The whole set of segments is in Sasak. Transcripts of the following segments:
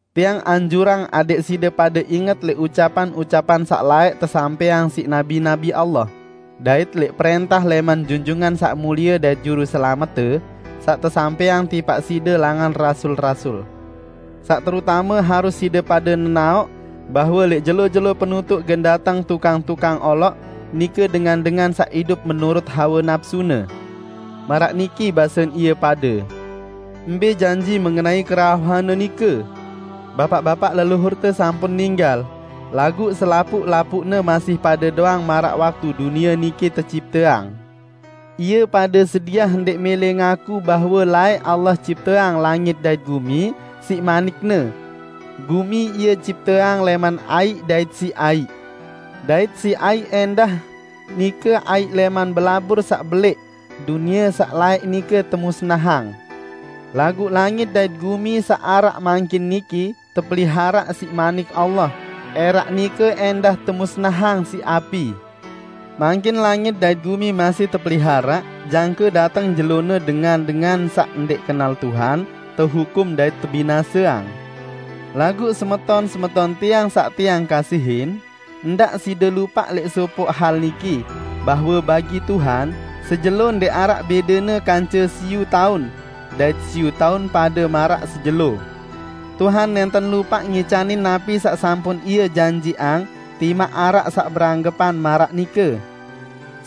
Tiang anjurang adẽq side pade inget lẽq ucapan-ucapan saq laẽq tesampẽang siq nabi-nabi Allah, dait lẽq prẽntah lẽman Junjungan Saq Mulie dait Juruselamette, saq tesampẽang tipaq side langan rasul-rasul. Saq terutame harus side pade nenaoq, bahwe lẽq jelo-jelo penutuq gen dateng tukang-tukang oloq, nike dengan-dengan saq idup menurut hawe napsune. Maraq niki basen ie pade, "Mbẽ janji mengenai kerauhan-Ne nike? Bapaq-bapaq leluhurte sampun ninggal, laguq selapuq-lapuqne masih pade doang maraq waktu dunie niki tecipteang!" Ie pade sediah ndẽq mẽlẽ ngaku bahwe laẽq Allah cipteang langit dait gumi siq manik-Ne. Gumi Ie cipteang lẽman aiq, dait siq aiq; dait siq aiq ẽndah -- nike aiq lẽman belabur saq belẽq -- dunie saq laẽq nike temusnahang. Laguq langit dait gumi saq araq mangkin niki tepeliharaq siq Manik Allah, ẽraq nike ẽndah temusnahang siq api. Mangkin langit dait gumi masih tepeliharaq jangke dateng jelone dengan-dengan saq ndẽq kenal Tuhan tehukum dait tebinaseang. Laguq semeton-semeton tiang saq tiang kasihin, ndaq side lupaq lẽq sopoq hal niki, bahwe bagi Tuhan, sejelo ndẽq araq bẽdene kance siyu taun -- dait siyu taun pade maraq sejelo. Tuhan nẽnten lupaq ngicanin napi saq sampun Ie janjiqang timaq araq saq beranggepan maraq nike.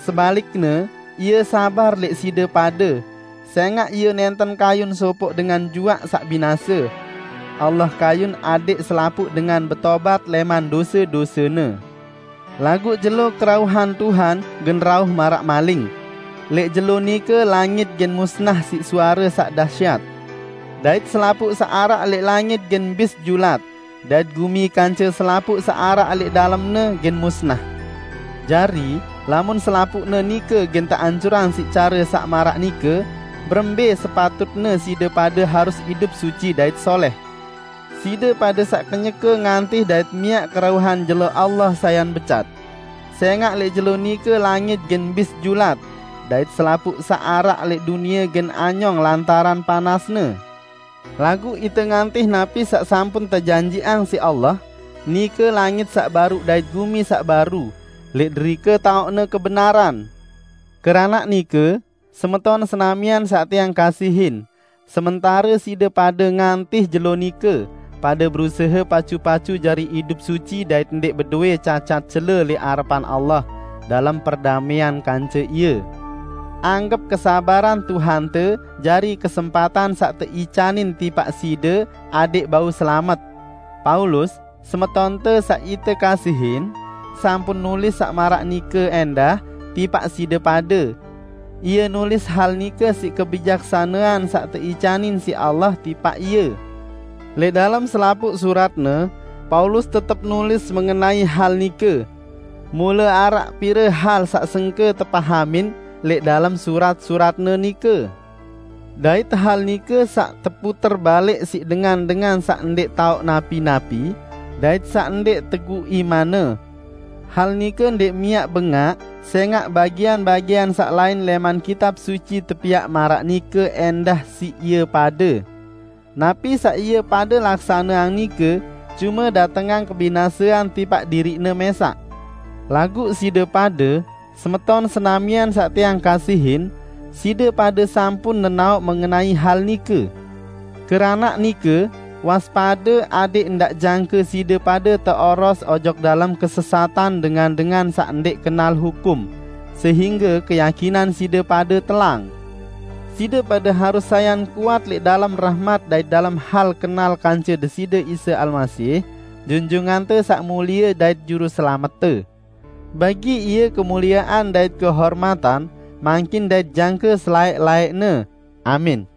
Sebalikne, Ie sabar lẽq side pade, sẽngaq Ie nẽnten kayun sopoq dengan juaq saq binase. Allah kayun adẽq selapuq dengan betobat lẽman dose-dosene. Laguq jelo kerauhan Tuhan gen rauh maraq maling. Lẽq jelo nike, langit gen musnah siq suare saq dahsyat, dait selapuq saq araq lẽq langit gen bis julat, dait gumi kance selapuq saq araq lẽq dalemne gen musnah. Jari, lamun selapuqne nike gen teancurang siq care saq maraq nike, berembẽ sepatutne side pade harus idup suci dait solẽh, side pade saq kenyeke ngantih dait miaq kerauhan jelo Allah sayan becat. Sẽngaq lẽq jelo nike langit gen bis julat, dait selapuq saq araq lẽq dunie gen anyong lantaran panasne. Laguq ite ngantih napi saq sampun tejanjiqang siq Allah, nike langit saq baru dait gumi saq baru, lẽq derike taoqne kebenaran. Keranaq nike, semeton senamian saq tiang kasihin, sementare side pade ngantih jelo nike, pade berusahe pacu-pacu jari idup suci dait ndẽq bedowẽ cacat cele lẽq arepan Allah, dalem perdamẽan kance Ie. Anggep kesabaran Tuhante jari kesempatan saq teicanin tipaq side adẽq bau selamet. Paulus, semetonte saq ite kasihin, sampun nulis saq maraq nike ẽndah tipaq side pade. Ie nulis hal nike siq kebijaksanean saq teicanin siq Allah tipaq ie. Lẽq dalem selapuq suratne, Paulus tetep nulis mengenai hal nike. Mule araq pire hal saq sengke tepahamin lẽq dalem surat-suratne nike. Dait hal nike saq teputer-balik siq dengan-dengan saq ndẽq taoq napi-napi dait saq ndẽq teguq imanne. Hal nike ndẽq miaq bengaq, sẽngaq bagian-bagian saq lain lẽman Kitab Suci tepiaq maraq nike ẽndah siq ie pade. Napi saq ie pade laksaneang nike cume datengang kebinasean tipaq diriqne mẽsaq. Laguq side pade, semeton senamian saq tiang kasihin, side pade sampun nenaoq mengenai hal nike. Keranaq nike, waspade adẽq ndaq jangke side pade teoros ojok dalem kesesatan dengan-dengan saq ndẽq kenal hukum, sehingge keyakinan side pade telang. Side pade harus sayan kuat lẽq dalem rahmat dait dalem hal kenal kance Deside Isa Almasih, Junjungante Saq Mulie dait Juruselamette. Bagi Ie kemuliean dait kehormatan, mangkin dait jangke selaẽq-laẽqne! Amin.